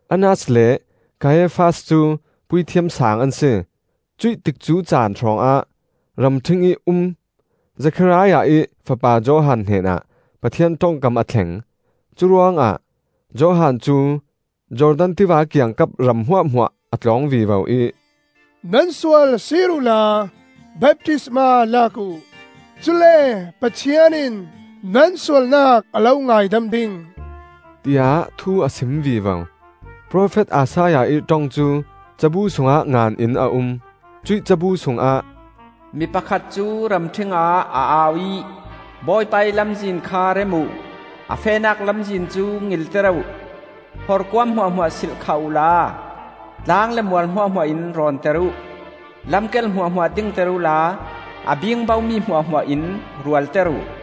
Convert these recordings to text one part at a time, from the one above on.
Annas le Kaiafas cu Puithiam Saang an si. Cuih tikcu caan hrawngah ramṭhing ih um Zekhariah ih fapa Johan hnenah Pathian ṭongkam a thleng. Curuangah Johan cu Jordan Tiva kiangkap ram hmuahhmuah a tlawng vivo ih, “Nan sual sir uhla baptisma lak uh; cule Pathian in nan sualnak a lo ngaidam ding,” tiah thu a sim vivo. Profet Isaiah ih ṭong cu cabu sungah ngan in a um. Cuih cabu sungah: “Mi pakhat cu ramṭhing ah a au ih, ‘Bawipa ih lamzin kha rem uh, a fehnak lamzin cu ngilter uh. Horkuam hmuahhmuah silhkhat uhla, tlang le mual hmuahhmuah in rawnter uh; Lam kel hmuahhmuah dingter uhla, a bingbo mi hmuahhmuah in rualter uh.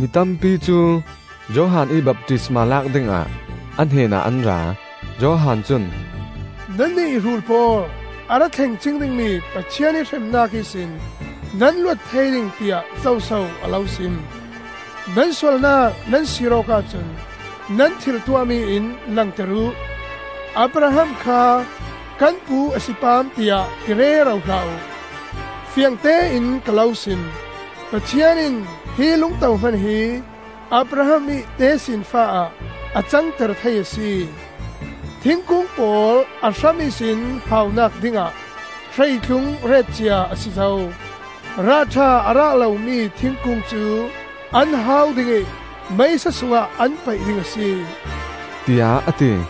Mitampi cu Johan ih baptisma lak dingah a hnenah an ra. Johan cun, “Nannih rul pawl! A ra thleng cing dingmi Pathian ih hremnak ihsin nan luat thei ding tiah zoso a lo sim? Nan sualnak nan sir awk ahcun nan thil tuahmi in langter uh. Abraham kha kan pu a si pam tiah ti rero hlah uh. Fiangtein ka lo sim: Pathian in hi lungto hman hi Abraham ih tesinfa ah a cangter thei a si. Thingkung pawl a hram ihsin haunak dingah hreitlung retcia a si zo. Rahṭha a rah lomi thingkung cu an hau ding ih meisa sungah an paih ding a si,” tiah a ti.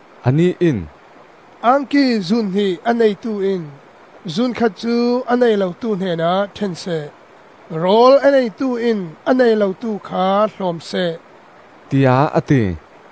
Anih in, “Angki zun hnih a neitu in zun khat cu a nei lotu hnenah ṭhen seh; rawl a neitu in a nei lotu kha hlawm seh,” tiah a ti.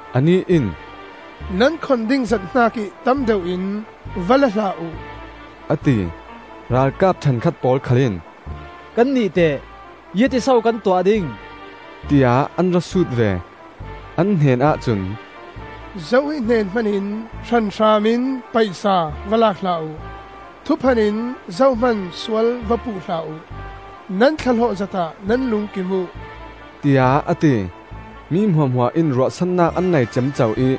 Anih in, “Nan khon ding zat hnakih tam deuh in va la hlah uh,” a ti. Ralkap ṭhenkhat pawl khal in, “Kannih teh? Ziangtin so kan tuah ding?” tiah an ra sut ve. An hnenah cun, “Zo ih hnen hmanin hranhram in paisa va lak hlah uh; thuphan in zohman sual va puh hlah uh. Nan thlahlawh zatah nan lungkim uh,” tiah a ti. Mi hmuahhmuah in ruahsannak an nei ciamco ih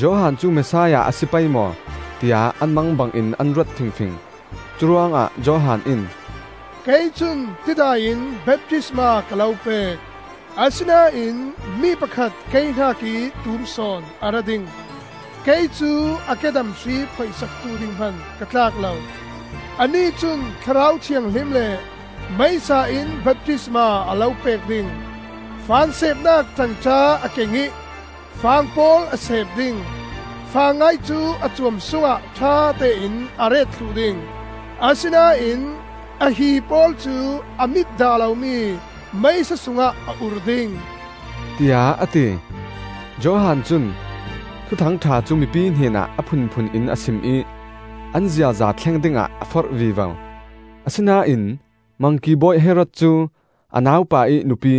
Johan cu Messiah a si pei maw, tiah an mangbangin an ruat fingfing. Curuangah Johan in, “Kei cun tidai in baptisma ka lo pek. Asinain mi pakhat kei hnakih tum sawn a ra ding. Kei cu a kedam hri phoih saktu ding hman ka tlak lo. Anih cun Thlarau Thianghlim le meisa in baptisma a lo pek ding. Fang seepnak ṭangṭa a keng ih fang pawl a seep ding. Fangngai cu a cuam sungah ṭhatein a ret thluh ding, asinain a hii pawl cu a mit dah lomi meisa sungah a ur ding,” tiah a ti. Johan cun Thuthang ṭha cu mipi hnenah a phunphun in a sim ih an ziaza thleng dingah a forh vivo. Asinain Mangki bawi Herod cu a naupa ih nupi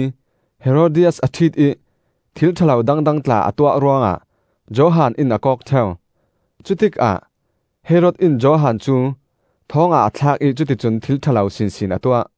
Herodias a ṭhit ih thil ṭha lo dangdang tla a tuah ruangah Johan in a kawk ṭheu. Cutikah Herod in Johan cu thawngah a thlak ih cuticun thil ṭha lo sinsin a tuah.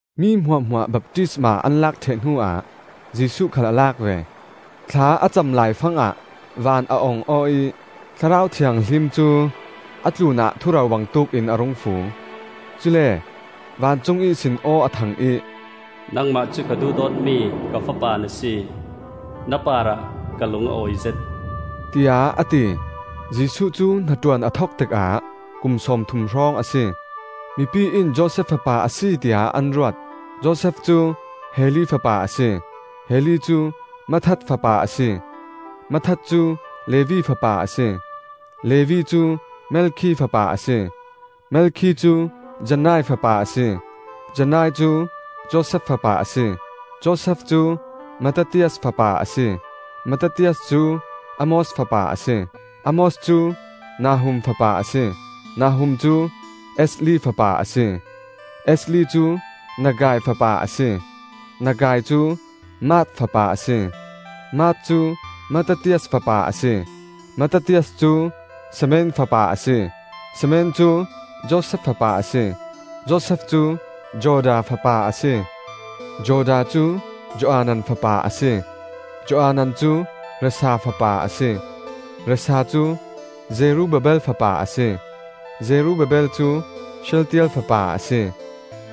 Mi hmuahhmuah baptisma an lak ṭheh hnuah Jesuh khal a lak ve. Thla a cam laifangah van a ong aw ih, Thlarau Thianghlim cu a tlunah thuro bangtuk in a rung fu. Cule vancung ihsin aw a thang ih, “Nangmah cu ka duhdawtmi ka Fapa na si. Na parah ka lung a awizet,” tiah a ti. Jesuh cu hnaṭuan a thok tikah kum sawmthum hrawng a si. Mipi in Josef fapa a si tiah an ruat. Josef cu Heli fapa a si, Heli cu Matthat fapa a si, Matthat cu Levi fapa a si, Levi cu Melkhi fapa a si, Melkhi cu Jannai fapa a si, Jannai cu Josef fapa a si, Josef cu Mattathias fapa a si, Mattathias cu Amos fapa a si, Amos cu Nahum fapa a si, Nahum cu Esli fapa a si, Esli cu Naggai fapa a si, Naggai cu Maath fapa a si, Maath cu Mattathias fapa a si, Mattathias cu Semein fapa a si, Semein cu Josef fapa a si, Josef cu Joda fapa a si. Joda cu Joanan fapa a si, Joanan cu Rhesa fapa a si, Rhesa cu Zerubbabel fapa a si, Jerubbabel cu Shealtiel fapa a si,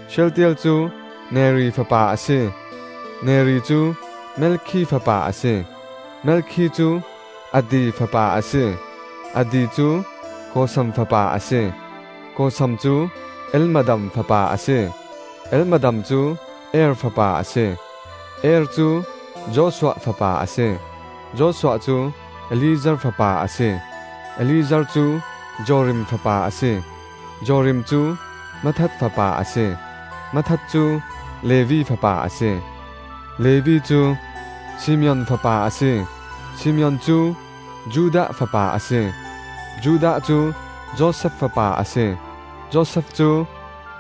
Shealtiel cu Neri fapa a si, Neri cu Melkhi fapa a si, Melkhi cu Addi fapa a si, Addi cu Kosam fapa a si, Kosam cu Elmadam fapa a si, Elmadam cu Er fapa a si, Er cu Joshua fapa a si, Joshua cu Eliezer fapa a si, Eliezer cu Jorim fapa a si, Jorim cu Matthat fapa a si, Matthat cu Levi fapa a si, Levi cu Simeon fapa a si, Simeon cu Judah fapa a si, Judah cu Josef fapa a si, Josef cu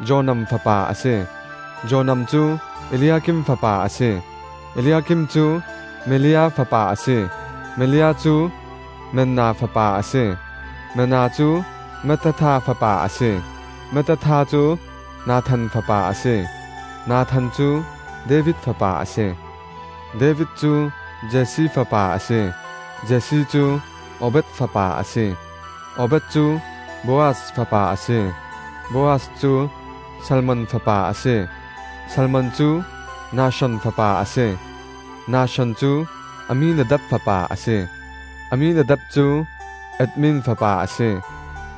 Jonam fapa a si, Jonam cu Eliakim fapa a si, Eliakim cu Melea fapa a si, Melea cu Menna fapa a si, Menna cu Mattatha fapa a si, Mattatha cu Nathan fapa a si, Nathan cu David fapa a si, David cu Jesse fapa a si, Jesse cu Obed fapa a si, Obed cu Boaz fapa a si, Boaz cu Salmon fapa a si, Salmon cu Nahshon fapa a si, Nahshon cu Amminadab fapa a si, Amminadab cu Admin fapa a si,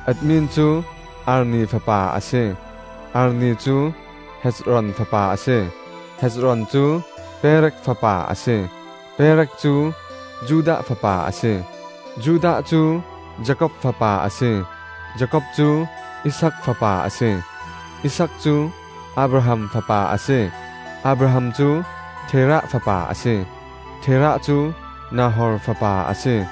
Admin cu Arni fapa a si, Arni cu Hezron fapa a si, Hezron cu Perez fapa a si, Perez cu Judah fapa a si, Judah cu Jakob fapa a si, Jakob cu Isaak fapa a si, Isaak cu Abraham fapa a si, Abraham cu Terah fapa a si, Terah cu Nahor fapa a si,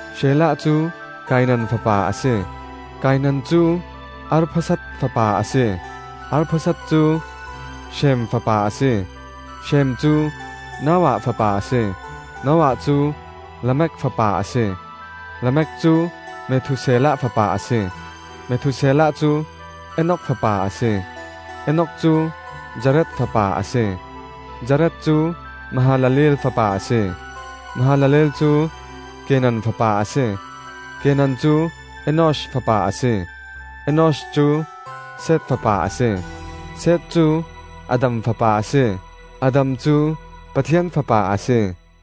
Shelah cu Kainan fapa a si, Kainan cu Arphaksad fapa a si, Arphaksad cu Shem fapa a si, Shem cu Noah fapa a si, Noah cu Lamek fapa a si, Lamek cu Methuselah fapa a si, Methuselah cu Enok fapa a si, Enok cu Jared fapa a si, Jared cu Mahalaleel fapa a si, Mahalaleel cu Kenan fapa a si, Kenan cu Enosh fapa a si, Enosh cu Seth fapa a si, Seth cu Adam fapa a si, Adam cu Pathian fapa a si.